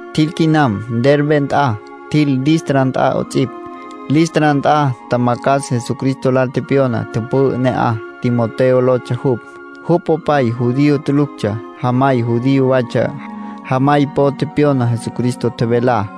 Tjil quinam Derbe nt'a, tjil Listra nt'a 'ots'ipj. Listra nt'a tjamacjas Jesucristo lal pyona tüpü'ü ne'aj, Timoteo lotsja jupj. Jupj popay judío tuluctsja. Jamay judío waytsja. Jamay po tepyona Jesucristo tjevelá.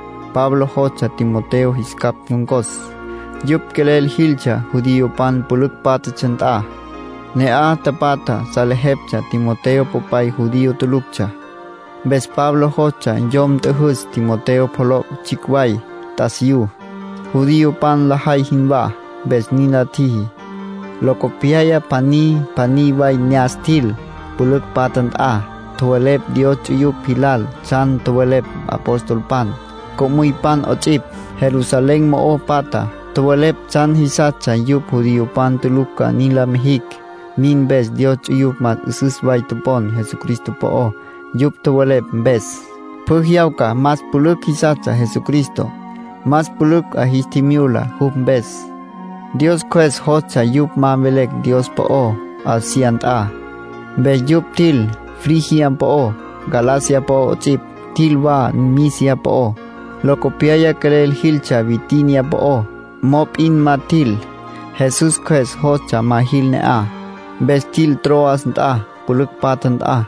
Pablo jostsja Timoteo jis capj ncon̈cos. Yupj quelel jiltsja judiopan pülücj pátjatsja nt'a. Ne'aj tapatja salejeptsja Timoteo popay judío tuluctsja. Mpes Pablo jostsja yom nt'üjüs Timoteo pjoloc' tsjicj way t'asiyú, judiopan lajay jinwá, mpes nin la tjiji. Locopyaya pjaní pjaní way ne'as tjil, pülücj patja nt'a. Tjowelepj Dios ts'uyupj jilal tsjan tjowelepj apostolpan, co'müypan 'ots'ipj, Jerusalén mo'o patjá. Tjowelepj tsjan jisastsja yupj judiopan tulucj ca nin la mijicj. Nin mpes Dios ts'uyupj más 'üsüs way topon Jesucristo po'ó, yupj tjowelepj mpes. Pjü jyawca más pülücj jisastsja Jesucristo, más pülücj 'a jis tjimyula jupj mpes. Dios Cjües jostsja yupj ma mvelecj Dios po'ó Asia nt'a. Mpes yupj tjil Frigia po'ó, Galacia po'ó 'ots'ipj. Tjil wa Misia po'ó. Locopyaya quelel jiltsja Bitinia po'ó. Mop'in ma tjil. Jesús Cjües jostsja ma jil ne'aj. Mpes tjil Troas nt'a, pülücj patja nt'a.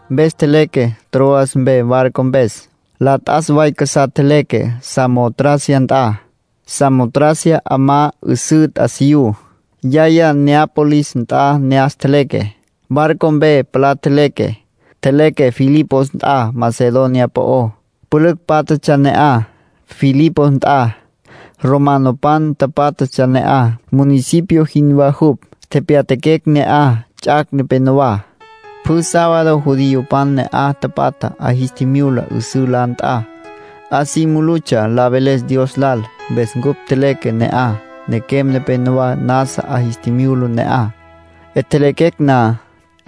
Mpes tjeleque Troas mpe barco mpes. La t'as way casá tjeleque Samotracia nt'a. Samotracia 'amá 'üsǘ t'asiyú. Yaya Neápolis nt'a ne'as tjeleque. Barco mpe palá tjeleque. Tjeleque Filipos nt'a Macedonia po'ó. Pülücj pátjatsja ne'aj, Filipos nt'a. Romanopan tapátjatsja ne'aj. Municipio jinwá jupj. Tepyatjaquecj ne'aj ts'ac' nepenowá. Pjü sábado judiopan ne'aj tapatjá 'a jis tjimyula 'üsǘ la nt'a. 'A si mulutsja la veles Dios lal. Mpes cupj tjeleque ne'aj. Nequem nepenowá nasa 'a jis tjimyula ne'aj. 'Etjelequecj na,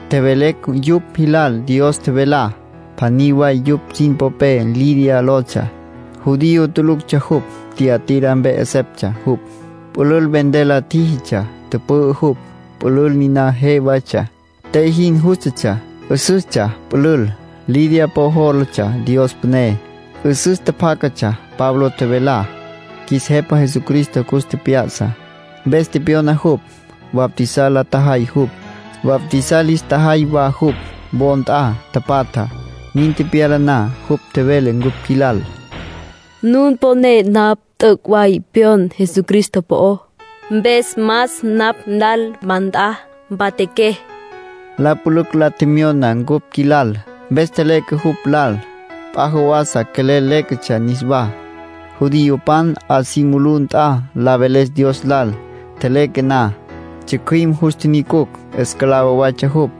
tjevelecj yupj jilal Dios tjevelá. Pjaní way yupj sin popé Lidia lotsja. Judío tuluctsja jupj. Tiatira mpe 'eseptsja jupj. Pülül vender la tjíjitsja, tüpü'ü jupj. Pülül niná je waytsja, te jin jústatsja. 'Üsüstsja pülül. Lidia po jólatsja Dios püné. 'Üsüs tjapjácatsja Pablo tjevelá. Qjuis Jepa Jesucristo cus tjep'ya'sa, mpes tepyona jupj. Bautizar la tjajay jupj. Bautizar lis tjajay wa jupj wo nt'a tapatjá. Nin tepyala na, jupj tjevele cupj qjuilal: “Nun poné napj t'üc' way pyon Jesucristo po'ó. Mpes mas napj lal nawá nt'a, mpatjaqué”, nin tjevele. La pülücj la tjemyona cupj qjuilal, mpes tjeleque jupj lal. P'a jawasa quelel léquetsja niswá, judiopan 'a si mulú nt'a, la veles Dios lal. Tjeleque na, tsjücjüim jus tjinyucucj. Esclavo waytsja jupj.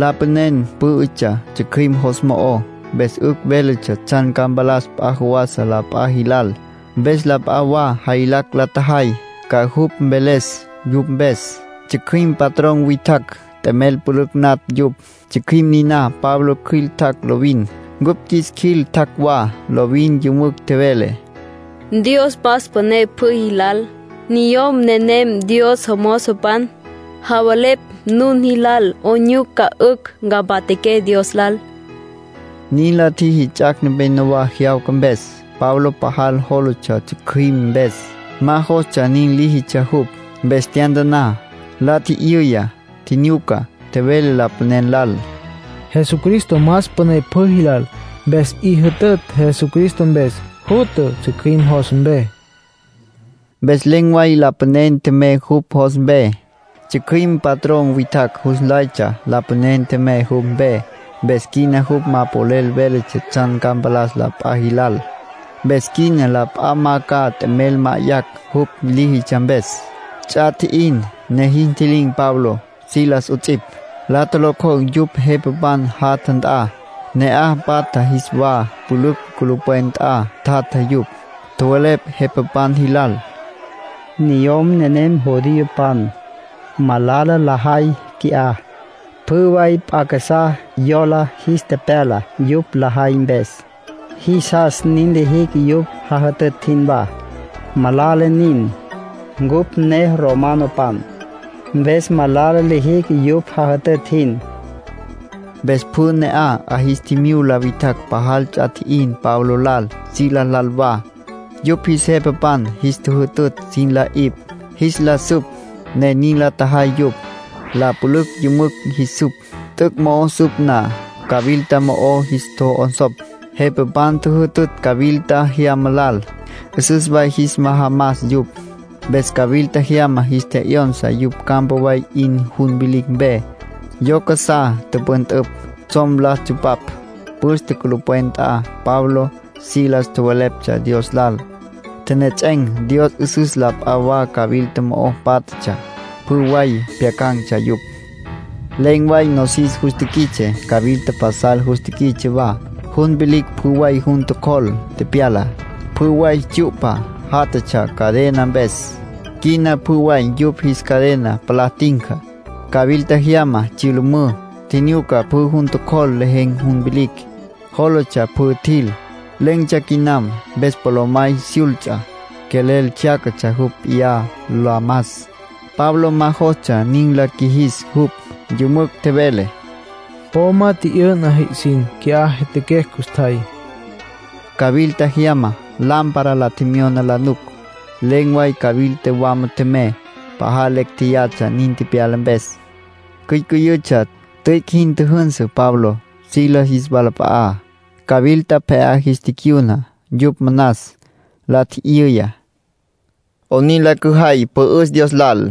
Lapanen pǘ'ütsja tsjücjüim jos mo'ó, mpes 'ücj véletsja tsjan ca mpalas p'a jawasa la p'a jilal. Mpes la p'a wa jaylacj la tjajay ca jupj mveles yupj mpes. Tsjücjüim patrón witjacj t'emel pülücj natj yupj. Tsjücjüim niná Pablo cjüil tjac' lovin, cupj qjuis qjuil tjac' wa. Lovin yümücj tjevele: —Dios más püné pjü jilal. Niyom nenem Dios jomozopan. Javelepj nun jilal 'oyn nyuca 'ücj ca mpatjaqué Dios lal —nin tjevele. Nin la tjiji ts'ac' nepenowá jyawca mpes. Pablo pajal jólatsja tsjücjüim mpes, ma jostsja nin líjitsja jupj. Mpes tyantaná, la tjijyu'ya, tjinyuca, tjevele lapanen lal: —Jesucristo más püné pjü jilal. Mpes 'i jütütj Jesucristo mpes, jutja tsjücjüim jos mpe. Mpes len̈ way lapanen tjemey jupj jos mpe. Tsjücjüim patrón witjacj jus nlaytsja lapanen tjemey jupj mpe, mpes quina jupj ma polel véletsja tsjan ca mpalas la p'a jilal. Mpes quina la p'a ma ca t'emel ma'ayacj jupj líjitsja mpes. Ts'a tji'in, ne jis ntji'lin̈ Pablo, Silas 'ots'ipj, la tjolocjocj yupj jepapan jatja nt'a. Ne'aj patja jis wa pülücj culupwen nt'a tjatja yupj. Tjowelepj jepapan jilal: —Niyom nenem judiopan. Malala lajay qui'á; pjü way p'a casá yola jis tepyala yupj lajay mpes. Jisas nin lijicj yupj jajütütj jinwá. Malala nin. Cupj ne romanopan, mpes malala lijicj yupj jajütütj jin —nin tjowelepj. Mpes pjü ne'aj 'a jis tjimyula witjacj pajal ts'a tji'in Pablo lal, Silas lal wa. Yupj jis jepapan jis tjüjütütj sin la 'ipj, jis la süp, ne nin la tjajay yupj. La pülücj yümücj jis süp. T'üc' mo'o süp na, cawilta mo'o jis tjo'onsopj. Jepapan tjüjütütj cawilta jyama lal, 'üsüs way jis majamas yupj. Mpes cawilta jyama jis tje'yonsa yupj campa way 'in jun vilicj mpe. Yo casá tüpüntüpj, tsjom la tsupapj. Püste culupwen nt'a, Pablo, Silas tjoweleptsja Dios lal. Tjenejets'en̈ Dios 'üsüs. La p'a wa cawilta mo'o pátjatsja, pjü way pjyacan̈tsja yupj. Len̈ way nosis jus tiquits'e. Cawilta pasal jus tiquits'e wa. Jun vilicj pjü way jun tjocjol tepyala. Pjü way tsyu'pa játjatsja cadena mpes, quina pjü way yupj jis cadena palá tinca. Cawilta jyama tsyülümǘ. Tjinyuca pjü jun tjocjol lejen̈ jun vilicj. Jólatsja pjü tjil, len̈tsja quinam. Mpes polomay syults'a, quelel tsjyaca jupj p'iyá, la mas. Pablo ma jostsja nin la qjuijis jupj. Yümücj tjevele: —Po ma tji'yü'na jipj sin, qui'á jyatjaquecj custjay. Cawilta jyama lámpara la tjemyona la nuc. Len̈ way cawilta wama tjemey. Pajal lecj jéyatsja nin tepyala mpes, cyücüyütsja. Tüic' jin tjüjünsü Pablo, Silas jis walap'a'á. Cawilta pje'á jis ticyuna yupj manas. La tji'yüya: —¿'Onin la cüjay mpü'üs Dios lal?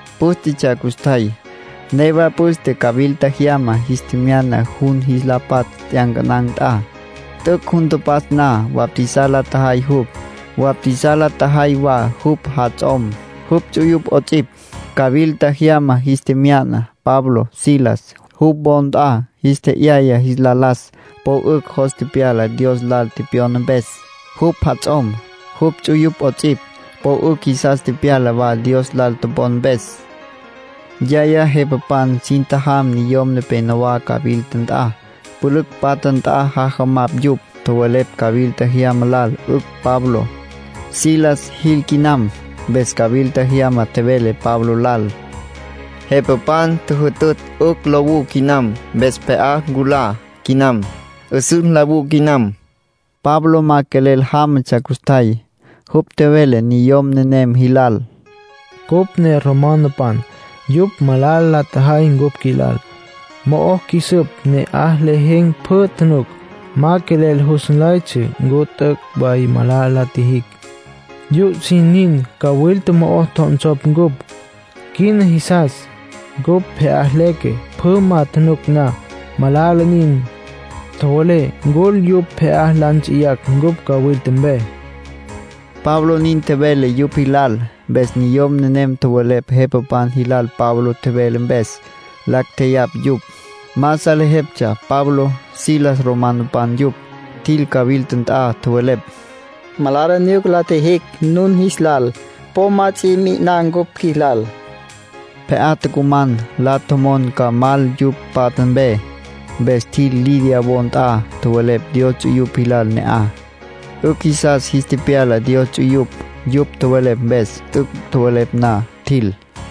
Pǘstetsja custjay, newa püste cawilta jyama jis tjemyana jun jis la patsj t'yancanan̈ nt'a. T'üc' jun tapatsj na, bautizar la tjajay jupj, bautizar la tjajay wa jupj jats'om, jupj ts'uyupj 'ots'ipj. Cawilta jyama jis tjemyana Pablo, Silas, jupj wo nt'a, jis tje'yaya jis la las. Po 'ücj jos tepyala Dios lal tepyona mpes. Jupj jats'om, jupj ts'uyupj 'ots'ipj, po 'ücj jisas tepyala wa Dios lal topon mpes. Yaya jepapan sin tjajam niyom nepenowá cawilta nt'a. Pülücj patja nt'a jajamapj yupj. Tjowelepj cawilta jyama lal, 'ücj Pablo, Silas jil quinam. Mpes cawilta jyama tjevele Pablo lal: —Jepapan tjüjütütj 'ücj lowú quinam. Mpes pje'á nculá quinam, 'üsüs nlawú quinam. Pablo ma quelel jámatsja custjay. Jupj tjevele niyom nenem jilal: —Cupj ne romanopan. Yupj malala la tjajay cupj qjuilal. Mo'o qjuis süp, ne'aj lejen̈ pjü tjunuc. Ma quelel jus nlaytsja ncu t'üc' way malala la tjijicj. Yupj sin nin cawilta mo'o tjo'onsopj cupj. Quina jisas cupj pje'á leque, pjü ma januc na. Malala nin. Tjowelé ncul, yupj pje'á la nts'iyacj cupj cawilta mpe —Pablo nin tjevele yupj jilal. Mpes niyom nenem tjowelepj jepapan jilal Pablo tjevele mpes. Lacj tjeyapj yupj. Ma salejeptsja Pablo, Silas romanopan yupj. Tjil cawilta nt'a. Tjowelepj: “Malala nyuca la tjijicj nun jilal. Po ma ts'i mi'iná cupj qjuilal”, nin tjowelepj. Pje'á tucuman, la tjomon ca mal yupj patja mpe. Mpes tjil Lidia wo nt'a. Tjowelepj Dios ts'uyupj jilal ne'aj. 'Ücj jisas jis tepyala Dios ts'uyupj, yupj tjowelepj mpes. T'üc' tjowelepj na, tjil.